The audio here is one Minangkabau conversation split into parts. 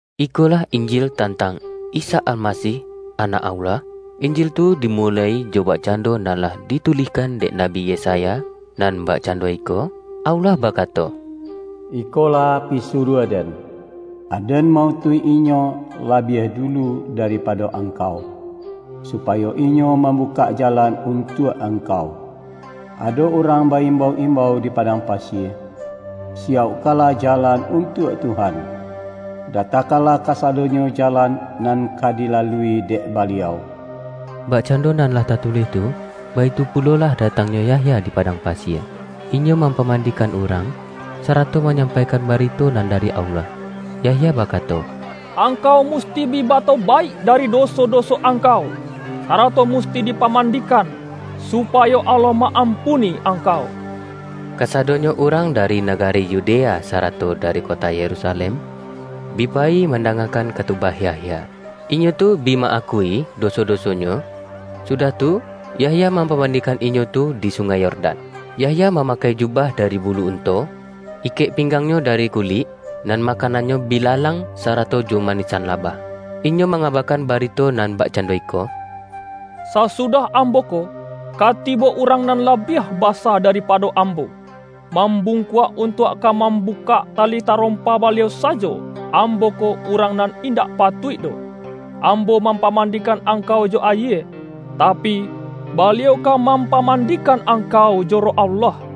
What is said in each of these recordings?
Ikolah Injil tantang Isa Almasih, Anak Allah. Injil tu dimuloi jo bakcando nan lah ditulihkan dek Nabi Yesaya, nan bakcando iko, Allah bakato,” ’Ikolah pisuruah-Den.’ ’Aden ma-utuih inyo labiah dulu daripado Angkau, supayo inyo mambukak jalan untuak Angkau.’ Ado urang ba-imbau-imbau di padang pasie, ’Siyaukkanlah jalan untuak Tuhan; datakanlah kasadonyo jalan nan ka dilalui dek Baliau.’” Bakcando nan lah tatulih tu, baitu pulolah datangnyo Yahya di padang pasie. Inyo mampamandikan urang, sarato manyampaikan barito nan da-ri Allah. Yahya bakato,”Angkau mus-ti bi batobaik dari doso-doso angkau, sarato musti dipamandikan, supayo Allah ma-ampuni angkau.” Kasado-nyo urang dari nagari Yudea sarato dari kota Yerusalem, bi payi manda-ngakan katubah Yahya. Inyo tu bi ma-akui doso-dosonyo, sudah tu, Yahya mampamandikan inyo tu di Sungai Yordan. Yahya mamakai jubah dari bulu un-to. Ikek pinggangnyo dari kulik, nan makanannyo bilalang, sarato jo ma-nisan labah. Inyo mangabakan bari-to nan bakcando iko,”Sasudah ambo ko, ka tibo Urang nan labiah basa daripado ambo. Mambungkuak untuak ka mambukak tali tarompa Baliau sa-jo, ambo ko, urang nan indak patuik doh. Ambo mampamandikan angkau jo ayie, tapi, Baliau ka mampamandi-kan angkau jo Roh Allah.”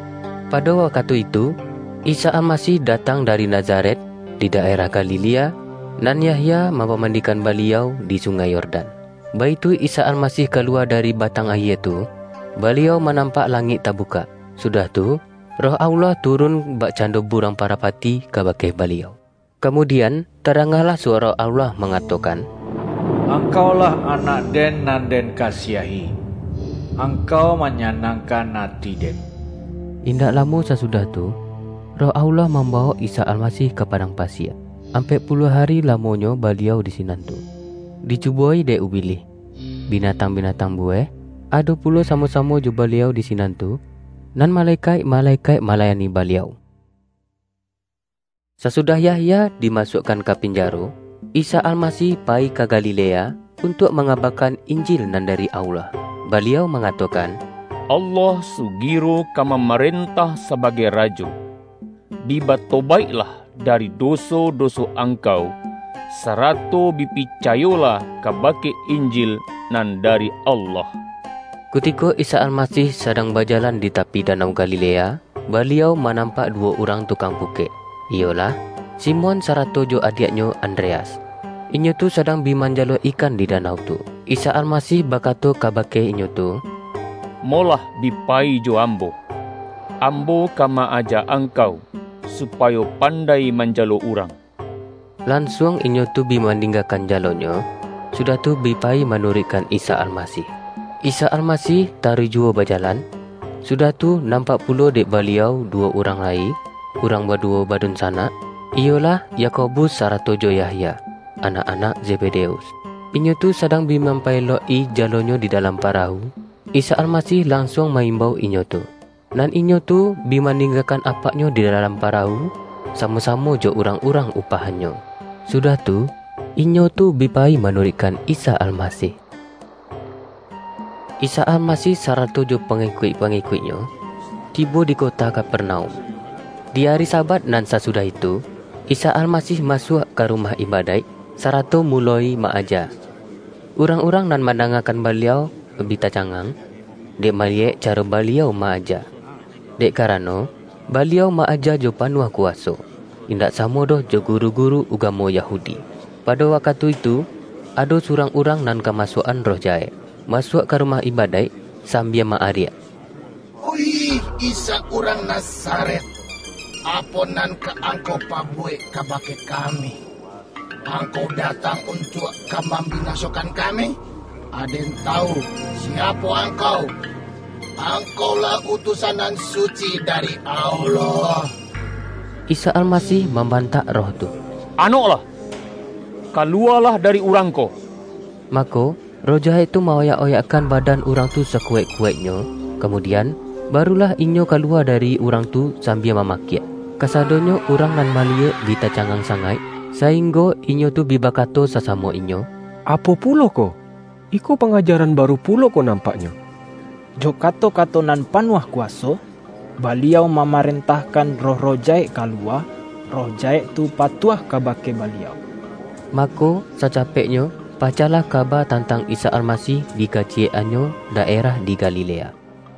Pado wakatu itu, Isa Almasih datang dari Nazaret, di daerah Galilea, nan Yah-ya mampamandikan Baliau di Sungai Yor-dan. Baitu Isa Almasih kaluwa dari ba-tang ayie tu, Baliau manampak langik tabukak, sudah tu, Roh Allah turun bak-cando buruang parapati kabake Baliau. Kamudian, tadangalah suwaro Allah mangatokan,”Angkau-lah Anak-Den, nan Den kasiahi. Angkau manyanangkan ati Den.” Indak lamo sasudah tu, Roh Allah mambawok Isa Almasih ka padang pa-sie. Ampek puluah ari lamonyo Ba-liau di sinan tu, dicubo-i dek Ubilih. Binatang-binatang buweh, ado pulo samo-samo jo Baliau di sinan tu, nan malekaik-malekaik malayani Baliau. Sasudah Yahya dimasuakkan ka pinjaro, Isa Almasih payi ka Galilea, untuak mangabakan Injil nan dari Allah. Baliau mangatokan,”Allah sugiro ka mamarentah sabagai Rajo. Bi batobaiklah dari doso-doso ang-kau, sarato bi picayolah kabake Injil nan dari Allah!” Kutiko Isa Almasih sadang baja-lan di tapi danau Galilea, Baliau ma-nampak duwo urang tukang pukek, iyolah, Simon sarato jo adiaknyo An-dreas. Inyo tu sadang bi manjalo ikan di danau tu. Isa Almasih bakato ka-bake inyo tu,”Molah bi payi jo Ambo, Ambo ka ma-aja angkau, supayo pan-dai manjalo urang.” Lansuang inyo tu bi maninggakan jalonyo, sudah tu bi payi manuruikkan Isa Almasih. Isa Almasih taruih juwo bajalan, sudah tu nampak pulo dek Baliau du-wo urang lai, urang baduwo badunsa-nak, iyolah, Yakobus sarato jo Yahya, anak-anak Zebedeus. Inyo tu sadang bi mampaelok-i jalonyo di dalam para-wu. Isa Almasih lansuang ma-imbau inyo tu. Nan inyo tu bi maninggakan apaknyo di dalam parawu, samo-sa-mo jo urang-urang upahannyo. Su-dah tu, inyo tu bi payi manuruikkan Isa Almasih. Isa Almasih sarato jo pangikuik-pangikuik-Nyo, tibo di kota Kaperna-um. Di ari Sabat nan sasudah itu, Isa Almasih masuak ka rumah ibadaik, sa-rato muloi ma-aja. Urang-urang nan mandangakan Baliau, bi tacangang, dek maliyek caro Baliau ma-aja. Dek karano, Baliau ma-aja jo panuah ku-waso, indak samo doh jo guru-guru ugamo Yahudi. Pado wakatu itu, ado surang urang nan kamasuak-an roh jahek, masuak ka rumah ibadaik, sambia ma-ariak, ”Oih Isa urang Nazaret, Apo nan ka Angkau pabuwek kabake kami? Ang-kau datang untuak ka mambinasokan kami? Aden tawu siapo Angkau: Ang-kau-lah Utusan Nan Suci dari Allah!” Isa Almasih mambantak roh tu,”Anoklah! Kaluwalah dari urang ko!” Mako, roh jahek tu ma-oyak-oyakkan badan urang tu sakuwaik-kuwaiknyo, kamudian, barulah inyo kaluwa dari urang tu sambia mama-kiak. Kasadonyo urang nan maliyek bi tacangang sangaik, sainggo inyo tu bi bakato sasamo inyo,”Apo pulo ko? Iko pangajaran baru pulo ko nampak-nyo. Jo kato-kato nan panuah kuwa-so, Baliau mamarentahkan roh-roh jahek kaluwa, roh jahek tu patuah ka-bake Baliau!” Mako, sacapeknyo, pacahlah ka-ba tantang Isa Almasih di kaciyek-an-nyo daerah di Galilea.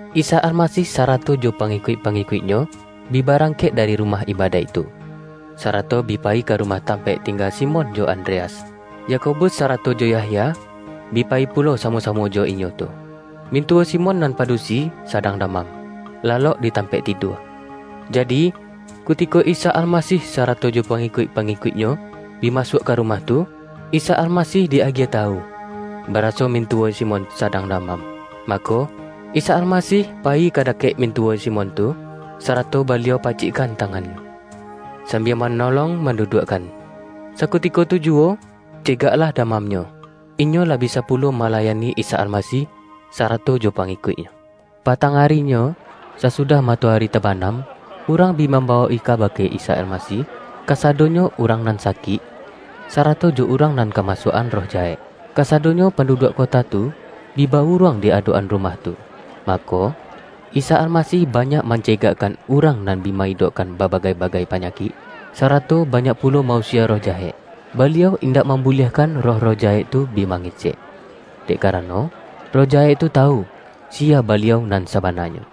Isa Almasih sarato jo pangikuik-pangikuik-Nyo, bi barangkek dari ru-mah ibadaik tu, sarato bi payi ka ru-mah tampaik tingga Simon jo Andreas. Yakobus sarato jo Yahya, bi payi pulo samo-samo jo inyo tu. Mintuwo Si-mon nan padusi, sadang damam, lalok di tampaik tidua. Jadi, kutiko Isa Alma-sih sarato jo pangikuik-pangikuik-Nyo, bi masuak ka rumah tu, Isa Almasih di-agiah tawu, baraso mintuwo Simon sa-dang damam. Mako, Isa Almasih pa-yi ka dakek mintuwo Simon tu, sarato Baliau pacikkan tangannyo, sambia ma-nolong manduduakkan. Sakutiko tu ju-wo, cegaklah damamnyo, inyo lah bi-sa pulo malayani Isa Almasih, sarato jo pangikuik-Nyo. Patang arinyo, sasudah matoari tabanam, urang bi mambawok-i kaba-ke Isa Almasih, kasadonyo urang nan sakik, sarato jo urang nan kamasuak-an roh jahek. Kasadonyo panduduak kota tu, bi ba-uruang di adok-an ru-mah tu. Mako, Isa Almasih banyak mancegakkan urang nan bi ma-idokkan babagai-bagai panyakik, sarato banyak pulo ma-usie roh jahek. Baliau indak mambuliahkan roh-roh jahek tu bi mangecek, dek karano, roh jahek tu tawu, siya Baliau nan sabananyo.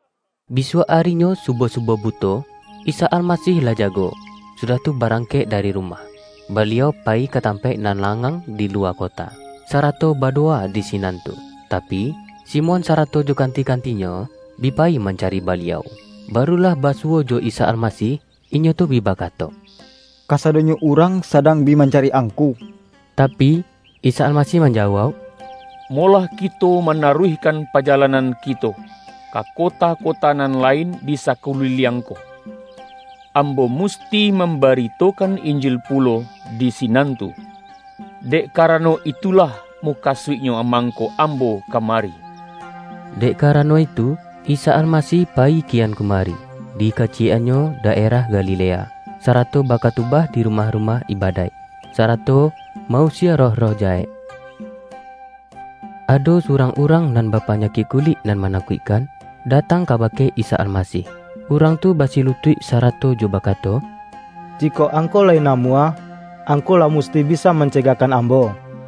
Bisuak arinyo subuah-subuah buto, Isa Almasih lah jago, sudah tu barang-kek dari rumah. Baliau payi ka tam-paik nan langang di luwa kota, sara-to badowa di sinan tu. Tapi, Simon sarato jo kanti-kantinyo, bi payi man-cari Baliau. Baru lah basuwo jo Isa Almasih, inyo tu bi bakato,”Kasadonyo urang sadang bi mancari Angku.” Tapi, Isa Almasih manjawauk,”Molah kito manaruihkan pajalanan kito, ka kota-kota nan lain di sakuli-liang ko. Ambo musti mambaritokan Injil pulo di sinan tu, dek karano, itu-lah mukasuiknyo mangko Ambo ka-mari.” Dek karano itu, Isa Almasih pa-yi kian kumari, dikaciyek-annyo da-erah Galilea, sarato bakatubah di ru-mah-rumah ibadaik, sarato ma-usie roh-roh jahek. Ado surang urang nan bapanya-kik kulik nan manakuikkan, datang kabake Isa Almasih. Urang tu basilu-tuik sarato jo bakato,”Jikok Angku lai namuah, Angku lah musti bisa man-cegakkan ambo.”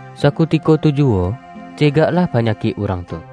Sakutiko tu juwo, cegaklah panyakik urang tu.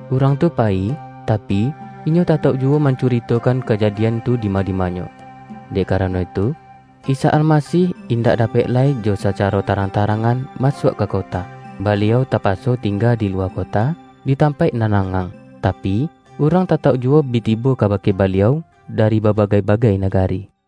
Urang tu payi, tapi, inyo tatauk juwo mancuritokan kajadian tu dima-dimanyo, dek karano itu, Isa Almasih indak dapek lai jo sacaro tarang-ta-rangan masuak ka kota. Baliau tapa-so tingga di luwa kota, di tampaik nan langang. Tapi, urang tatauk juwo bi tibo kabake Baliau dari babagai-ba-gai nagari.